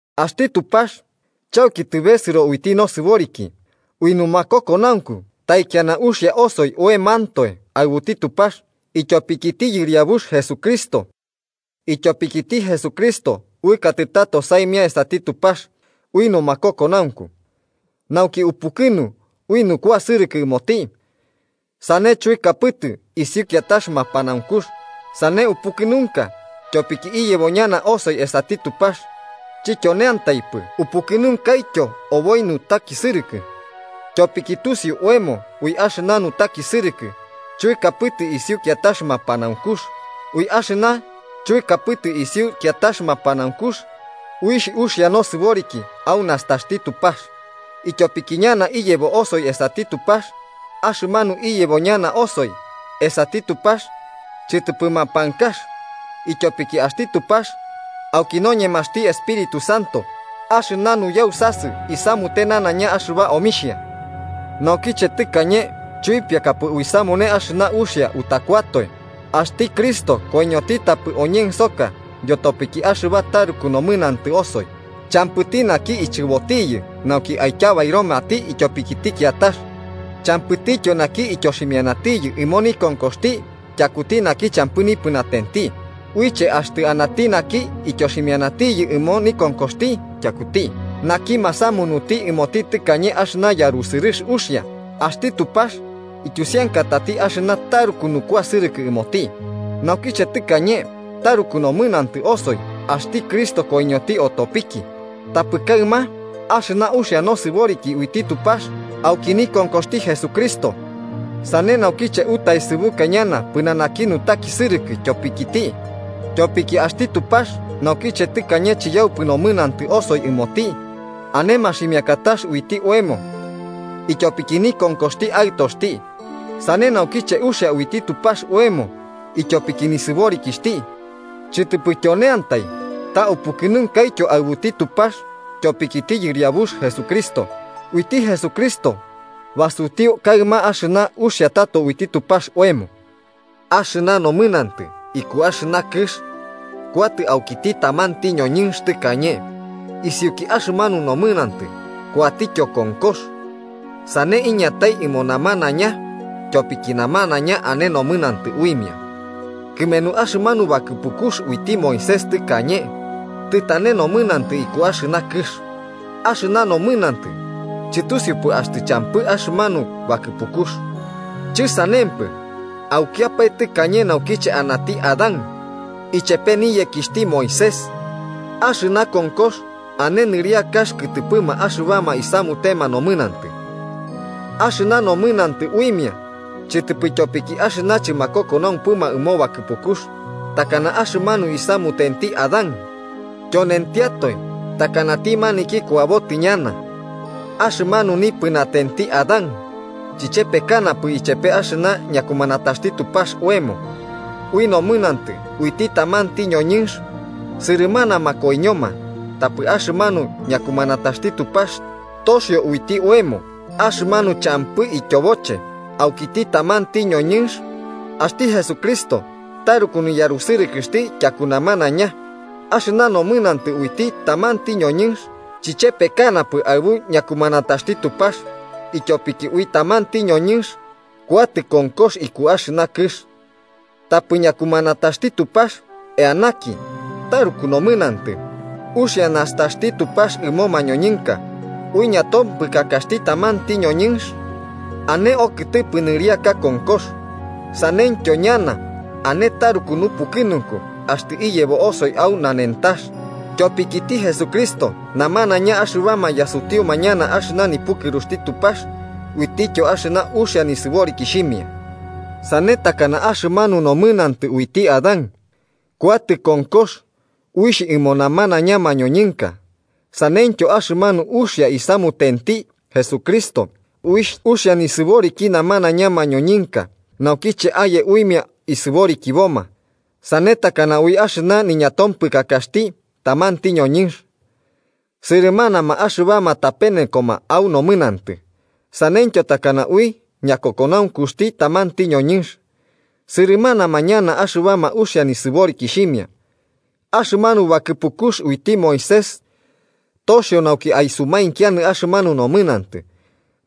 Axti Tupax, chauki tɨbesɨro uiti nosɨboriki, ui numakokonaunku, taikiana uxia osoi oemantoe aɨbuti Tupax, ityopikiti Yɨriabux Jesucristo. Ityopikiti Jesucristo uɨkatɨ tato saimia esati Tupax ui numakokonaunku, nauki upukɨnu ui nukuasɨrɨkɨ ɨmoti, sane chuɨkapɨtɨ isiu kiatax mapanaunkux, sane upukɨnunka tyopiki iyebo ñana osoi esati Tupax. Chityoneantaipɨ, upukɨnunkaityo oboi nutakisɨrɨkɨ. Tyopiki tusiu oemo ui axɨna nutakisɨrɨkɨ chuɨkapɨtɨ isiu kiatax mapanaunkux, ui axɨna chuɨkapɨtɨ isiu kiatax mapanaunkux, uixh uxia nosɨboriki au nastaxti Tupax ityopiki ñana iyebo osoi esati Tupax. Axɨmanu iyebo ñana osoi esati Tupax, chɨtɨpɨ mapankax, ityopiki axti Tupax auki noñemaxti Espíritu Santo axɨna nuyausasɨ isamute nanaiña axɨba omixhia. Naukiche tɨkañe chuipiakapɨ uisamune axɨna uxia utakuatoe, axti Cristo koiñoti tapɨ oñensoka yotopiki axɨba taruku nomɨnantɨ osoi. Champɨti naki ichɨbotiyɨ nauki aityabairomati ityopikiti kiatax. Champɨtityo naki ityoximianatiyɨ ɨmo nikonkoxti tyakuti naki champɨ nipɨnatenti. Buiche axtɨ anati naki ityoximianatiyɨ ɨmo nikonkoxti tyakuti naki masamunuti ɨmoti tɨkañe axɨna yarusɨrɨx uxia. Axti Tupax ityusiankatati axɨna taruku nukuasɨrɨkɨ ɨmoti, naukiche tɨkañe taruku nomɨnantɨ osoi axti Cristo koiñoti otopiki. Tapɨ kaɨma axɨna uxia nosɨboriki uiti Tupax auki nikonkoxti Jesucristo. Sane naukiche utaesɨbuka ñana pɨnanaki nutakisɨrɨkɨ tyopikiti. Tyopiki axti Tupax naukiche tɨkañe chiyaupɨ nomɨnantɨ osoi ɨmoti, ane maximiakatax uiti oemo ityopiki nikonkoxti Aɨtoxti, sane naukiche uxia uiti Tupax oemo ityopiki nisɨborikixhti. Chɨtɨpɨ tyoneantai, ta upukɨnunkaityo aɨbuti Tupax ityopikiti Yɨriabux Jesucristo, uiti Jesucristo basutiu kaɨma axɨna uxia tato uiti Tupax oemo. Axɨna nomɨnantɨ iku axɨna kɨx kuatɨ aukiti tamanti ñoñɨnx tɨkañe, isiuki axɨmanu nomɨnantɨ kuatityo konkox, sane iñatai ɨmo namanaiña tyopiki namanaiña ane nomɨnantɨ uimia. Kɨmenu axɨmanu bakɨpukux uiti Moisés tɨkañe, tɨtane nomɨnantɨ iku axɨna kɨx. Axɨna nomɨnantɨ chɨtusiupɨ axtɨ champɨ axɨmanu bakɨpukux. Chɨsanempɨ, aukiapae tɨkañe naukiche anati Adán ichepe niyekixhti Moisés, axɨna konkox ane nɨriakax kɨtɨpɨma axɨbama isamutema nomɨnantɨ, axɨna nomɨnantɨ uimia chɨtɨpɨ ityopiki axɨna chɨmakokonaumpɨma ɨmo bakɨpukux, takana axɨmanu isamutenti Adán, tyonentiatoe takanati maniki kuabotɨ ñana. Axɨmanu nipɨnatenti Adán, chɨchepekanapɨ ichepe axɨna ñakumanataxti Tupax oemo. Ui nomɨnantɨ uiti tamanti ñoñɨnx sɨrɨmanama koiñoma. Tapɨ axɨmanu ñakumanataxti Tupax toxio uiti oemo axɨmanu champɨ ityoboche aukiti tamanti ñoñɨnx, axti Jesucristo taruku niyarusɨrɨkɨx tyaku namanaiña. Axɨna nomɨnantɨ uiti tamanti ñoñɨnx chichepekanapɨ aɨbu ñakumanataxti Tupax. Ityopiki ui tamanti ñoñɨnx kuatɨ konkox iku axɨna kɨx. Tapɨ ñakumanataxti Tupax, eanaki taruku nomɨnantɨ, uxia nastaxti Tupax ɨmo mañoñɨnka. Ui ñatompɨkakaxti tamanti ñoñɨnx ane okɨtɨpɨ nɨriaka konkox, saneityo ñana ane taruku nupukɨnunku axtɨ iyebo osoi au nanentax tyopikiti Jesucristo, namanaiña axɨbama yasutiuma ñana axɨna nipukɨruxti Tupax uitityo axɨna uxia nisɨborikixhimia. Sane takana axɨmanu nomɨnantɨ uiti Adán kuatɨ konkox uixh ɨmo namanaiña mañoñɨnka, saneityo axɨmanu uxia isamutenti Jesucristo uixh uxia nisɨboriki namanaiña mañoñɨnka nauki aye uimia isɨborikiboma. Sane takana ui axɨna niñatompɨkakaxti tamanti ñoñɨnx, sɨrɨmanama axɨbama tapenekoma au nomɨnantɨ. Saneityo takana ui ñakokonaunkuxti tamanti ñoñɨnx, sɨrɨmanama ñana axɨbama uxia nisɨborikixhimia. Axɨmanu bakɨpukux uiti Moisés toxio nauki aisumainkianɨ axɨmanu nomɨnantɨ.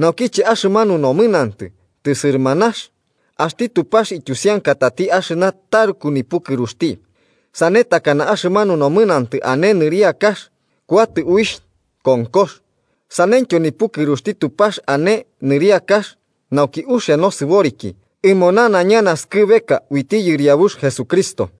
Naukiche axɨmanu nomɨnantɨ tɨsɨrɨmanax, axti Tupax ityusiankatati axɨna taruku nipukɨruxti. Sane takana axɨmanu nomɨnantɨ ane nɨriakax kuatɨ uixh konkox, saneityo nipukɨruxti Tupax ane nɨriakax nauki uxia nosɨboriki ɨmo nanaiña naskɨbeka uiti Yɨriabux Jesucristo.